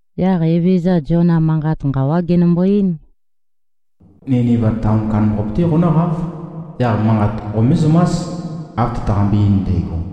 Yaq Evezøza Ziona manqat nqawá genømbo-eín, “Niniva taon kandambaqape-té qonǿqáv. Yaq manqat qomézømás, av tøtaqambe-ein ndægo.”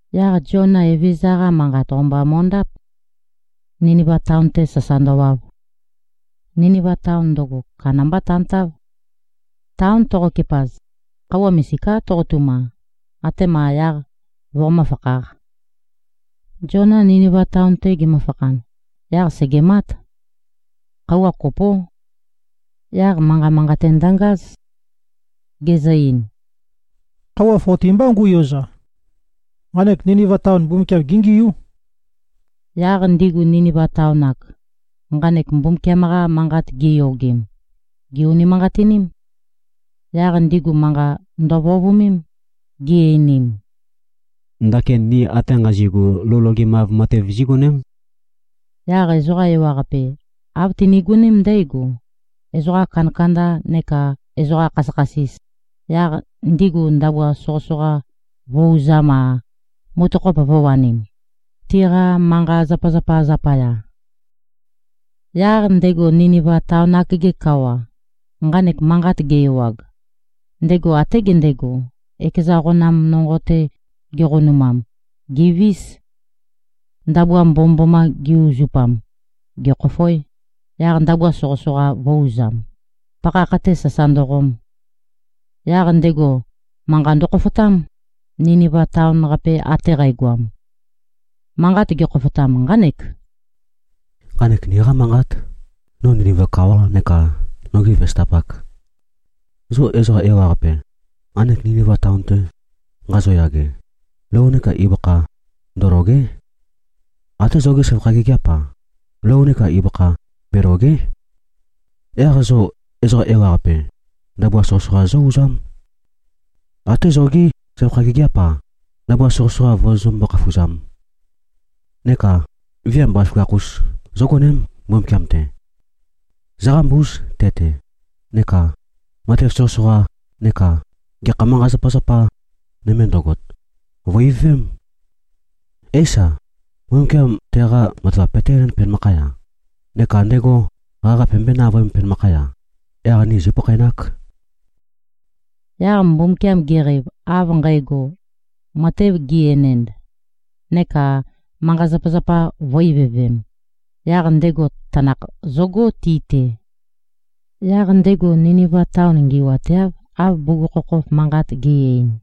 Yaq Ziona Evezøza-qa manqat, o-mba mo꞉ndáp, Niniva taon-te sasa ndøwav. Niniva taon ndøgo, kandambá tantáv. Taon toqokepaz, khøuwa misiká toqotuma, atema yaq voqomǿ-fakhāq. Ziona Niniva taon-te gemøfakhan, yaq sègemát. Khøuwa kopó. Yaq manqa manqate ndøngáz. Gezø-ein, “Khøuwa foti mbá ngu꞉yoza. Nqanek Niniva taon, Mbumbukiam géngiú.” Yaq ndigu Niniva taon-ak, nqanek Mbumbukiam-qa manqat giyogem, gè-unimanqatiním. Yaq ndigu manqa ndøvøovømém, gi-einim, “Ndakin ni ate nqazi꞉gu, lou logemav matev zígoném.” Yaq ezoqa ewaqape, av tinigoném ndǽgo, ezoqa kandakanda neka꞉ ezoqa khasøkhasis, yaq ndigu ndabua soqøsoqa vø̄-uzam-a, mutøkhop vø̄wanim, tiqa manqa-zapazapa zapaya. Yaq ndego Niniva taon-ak-ge kawa, nqanek manqat ge-ewag, ndego até gendego, ekeza qonam nonqo-te geqonumam, gèvís. Ndabua mbomømboma ge-uzupam, gekhòfoē, yaq ndabua soqøsoqa vø̄-uzam, pakhakh-te sasa ndøqom. Yaq ndego manqa ndøkhofotám, Niniva taon-qape ate qægoam. Manqat gekhoføtam nqánek, “Nqanek niqá manqát, no Niniva kawa neka nogi vesøtapak. Zo ezoqa ewaqape, nqanek Niniva taon-te nqazoyage, lou neka ibøkha ndølòge᷄. Até zogí søvakha gigiáp-a, lou neka ibøkha belòge᷄. Yaq zo ezoqa ewaqape ndabua soqøsoqa zó-uzám. Até zogí søvakha gigiáp-a, ndabua soqøsoqa vozozømbó-khafuzām. Neka viam bazaføgakh-us zógoném Mbumbukiam-te. Zóqambúz te-te, neka matev soqøsoqa neka gekha manqa-zapazapa nøme ndøgot, vø̀-ivøvém. Éisa, Mbumbukiam teqa matavap peté-enēnd penømakhaya, neka ndego qaqa pømbøé-navøēm penømakhaya. Yaq ni zīpakhaenāk.” Yaq Mbumbukiam geqeiv av nqægo, matev gi-enend neka manqa-zapazapa vø̄-ivøvem, yaq ndego tanakh zøgó ti-te. Yaq ndego Niniva taon ngi꞉wateáv, av bugukhokhof manqat ge꞉-ein.